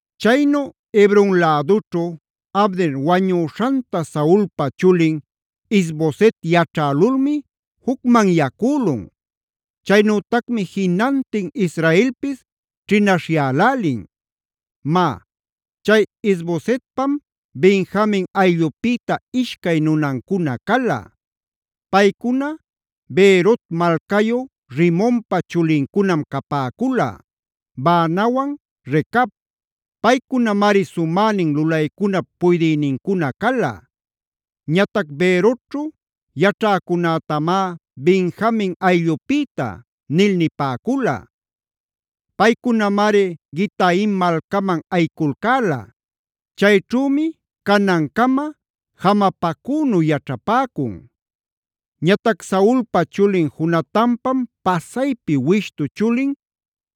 Chaynu Hebron lädućhu Abner wañüśhanta Saulpa chulin Is-boset yaćhälulmi jucmanyacülun. Chaynütacmi jinantin Israelpis ćhinaśhyälälin. Má, chay Is-bosetpam Benjamin ayllupïta ishcay nunancuna cala. Paycuna Beerot malcayu Rimonpa chulincunam capäcula: Baanawan Recab. Paycunamari sumänin lulaycunap puydïnincuna cala. (Ñatac Beerotćhu yaćhäcunätamá “Benjamin ayllupïta” nil nipäcula. Paycunamari Gitaim malcaman ayiculcäla. Chayćhümi canancama jamapacünu yaćhapäcun.) Ñatac Saulpa chulin Jonatanpam pasaypi wishtua chulin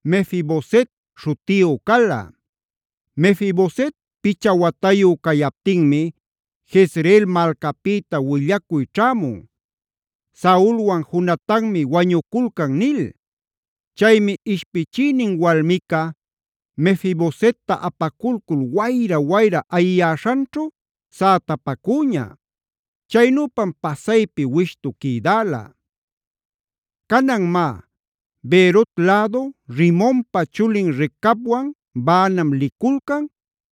Mefi-boset śhutiyu cala. Mefi-boset picha watayu cayaptinmi Jezreel malcapïta willacuy ćhämun: “Saulwan Jonatanmi wañuculcan” nil. Chaymi ishpichïnin walmica Mefi-bosetta apaculcul wayra-wayra ayiyäśhanćhu sätapacüña. Chaynüpam pasaypi wishtu quïdäla. Canan má, Beerot lädu Rimonpa chulin Recabwan Baanam liculcan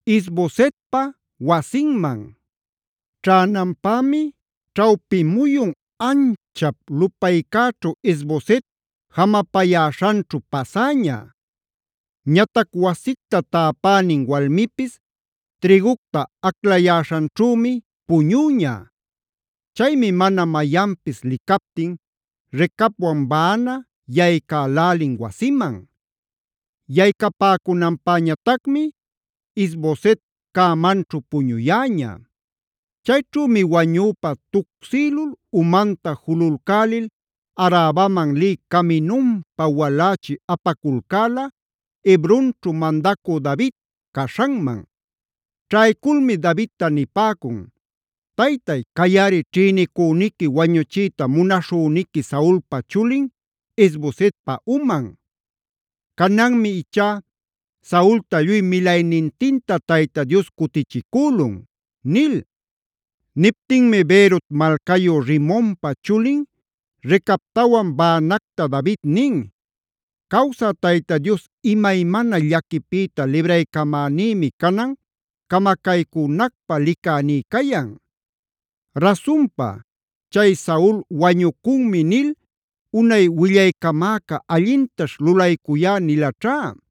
Is-bosetpa wasinman. Ćhänanpämi ćhawpi muyun anchap lupaycäćhu Is-boset jamapäyäśhanćhu pasäñab. Ñatac wasicta täpänin walmipis trïgucta aclayäśhanćhümi puñüña. Chaymi mana mayanpis licaptin Recabwan Baana yaycälälin wasiman. Yaycapäcunanpäñatacmi Is-boset cämanćhu puñuyäña. Chayćhümi wañüpa tucsïlul umanta jululcälil Arabaman lï caminunpa walächi apaculcäla, Hebronćhu mandacü David caśhanman. Ćhayculmi Davidta nipäcun: “Taytay, cayꞌari ćhïnicüniqui wañuchiyta munaśhüniqui Saulpa chulin Is-bosetpa uman. Cananmi ichá Saulta lluy milaynintinta Tayta Dios cutichicülun” nil. Niptinmi Beerot malcayu Rimonpa chulin Recabtawan Baanacta David nin: “Cawsä Tayta Dios imaymana llaquipïta libraycamänïmi canan camacaycünacpa licäní cayan. Rasunpa, chay ‘Saul wañucunmi’ nil unay willaycamäca ‘allintaćh lulaycuyá’ nilaćhá.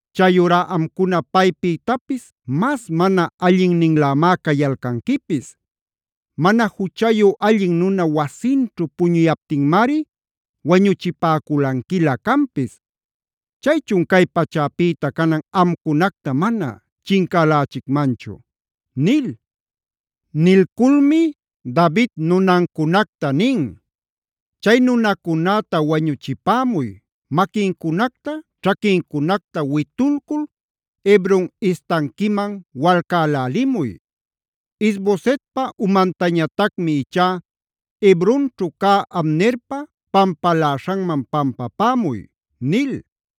Chayurá amcuna paypïtapis mas mana allinninlämá cayalcanquipis. Mana juchayu allin nuna wasinćhu puñuyaptinmari wañuchipäculanquilä canpis. ¿Chaychun cay pachäpïta canan amcunacta mana chincälächicmanchu?” nil. Nilculmi David nunancunacta nin: “Chay nunacunäta wañuchipämuy, maquincunacta ćhaquincunacta witulcul Hebron istanquiman walcälälimuy. Is-bosetpa umantañatacmi ichá Hebronćhu cä Abnerpa pampaläśhanman pampämuy” nil.